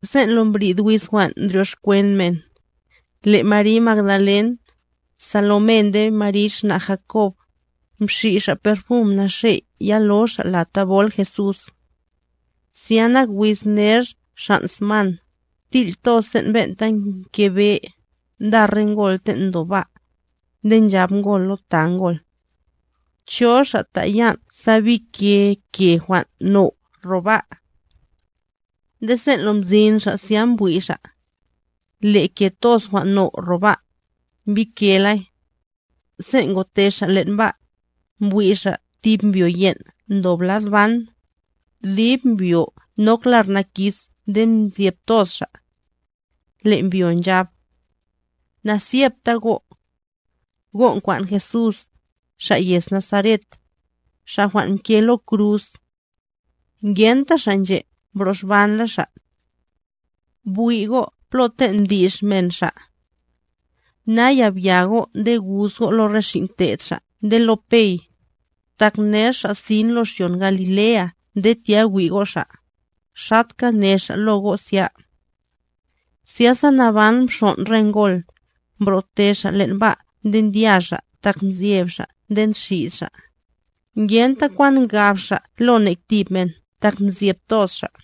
Sen' lo mbrid wiz jwan' ndryoxkwen men, le' Mary Magdalen, Salomé nde Mary xna' Jakob, mxi' xa' perfum naxe' yalo xa' lad thabol Jesús. Zya nak wiz ner xan' sman, til' toz sen' ben'ta mke be, nda re ngol ten' ndob ba'. Nde nchab ngol lo ta ngol: —¿Cho xa' ta' yan' sa bike ke jwan' now' ro ba'? Nde sen' lo mzin xa' zya mbwi' xa', le' ke toz jwan' now' ro ba', mbikelay. Sen' ngote xa' len' ba', mbwi' xa' tib mbyo yen'a ndob lad ban, dib mbyo nok lar nakis nde mzyeb toz xa'. Le' mbyo nchab: —¡Nazyebta go'! Go' nkwan' Jesús, Xa' yez Nazaret, Xa' jwan' mke lo kruz. Ngenta Xa' nche' mbroxbanla Xa'. Bwi' go' plo ten' mdi'x men Xa'. Naya bya go' nde guz go' lo re xin' te'd Xa' nde lo Pey, tak ner Xa' sin lo xyon Galilea nde tya wi' go' Xa', xatka ne Xa' lo go' zya. Zyasa naban mxon' re ngol, mbrote xa' len' ba' nde ndya xa' tak mzyeb xa' nde nxid xa'; ngenta kwan ngab xa' lo nek tib men tak mzyeb toz xa'.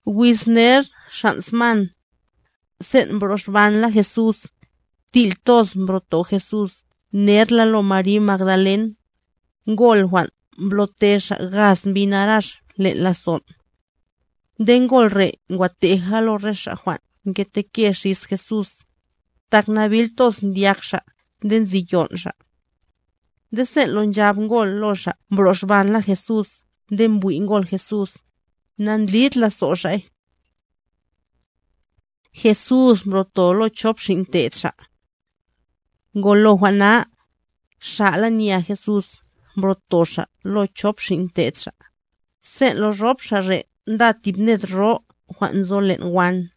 Wiz ner xan' sman, sen' mbroxbanla Jesús, til' toz mbroto Jesús nerla lo Mary Magdalen, ngol jwan' mblo'te Xa' gaz mbi narax len' lazon'. Nde ngol re' ngwa teja lo re xa' jwan' mketenke xis Jesús, tak nabil toz ndyak xa' nde nzi yon' xa'. Nde sen' lo nchab ngol lo xa' mbroxbanla Jesús nde mbwi' ngol Jesús, na'ndlid lazo' xa'y. Jesús mbroto lo chop xin' te'd Xa' Ngolo jwan' na, xa'la nya Jesús mbro'to Xa' lo chop xin' te'd Xa', sen' lo rop xa' re' nda tib ned ro jwan' nzo len' wan.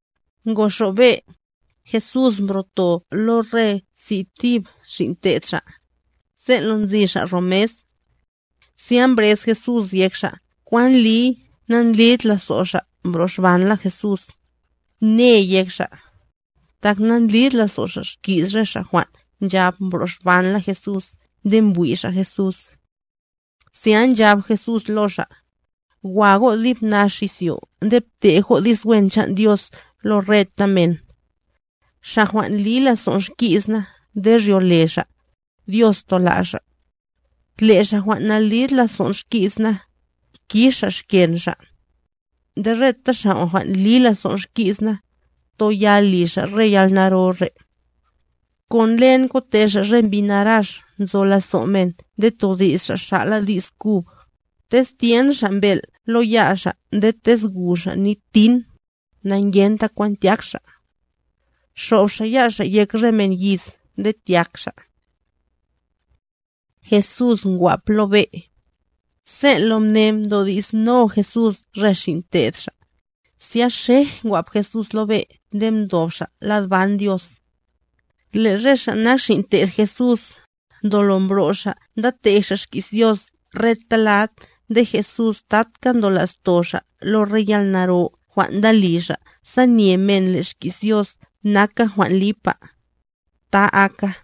Ngoxob be', Jesús mbro'to lo re si' thib xin' te'd Xa', sen' lo nzi xa' ro mes. Zya mbrez Jesús yek xa' kwan ndliy nandlid lazo' xa' mbroxbanla Jesús, ne yek xa', tak namblid lazo' xa' xki's re xa' jwan' nchab mbroxbanla Jesús nde mbwi' xa' Jesús. Zya nchab Jesús lo xa': —Wa go' dib nax izyo nde btej go' di's wen chan' Dios lo reta men. Xa' jwan' li lazo'n xki's na nde ryole xa', Dios tola' xa'. Le' xa' jwan' nalid lazon' xki's na, kix xa' xken xa'. Nde reta xa' jwan' li lazo'n xki's na, toyal li xa' re yalnaro re': Kon len kote xa' re mbi narax nzo lazo' men nde todi's xa' xa'la di's kub, tez tyen xa' mbel' lo ya' xa' nde tez gu xa' nit kwan', na'ngenta kwan tyák xa'. Xob xa' ya' xa' yek re men yiz nde tyak xa'. Jesús ngwap lo be' Sen' lo mne mdodi'sno Jesús re xin' te'd Xa', zya xej ngwap Jesús lo be' nde mdob Xa' lad ban Dios. Le' re xa' nak xin' te'd Jesús, ndolo mbro' xa' nda tej xa' xki's Dios reta lad nde Jesús tatka ndola'sto xa' lo re yalnaro jwan' nda li xa' sa nye men le' xki's Dios naka jwan' lipa. ¡Ta aka!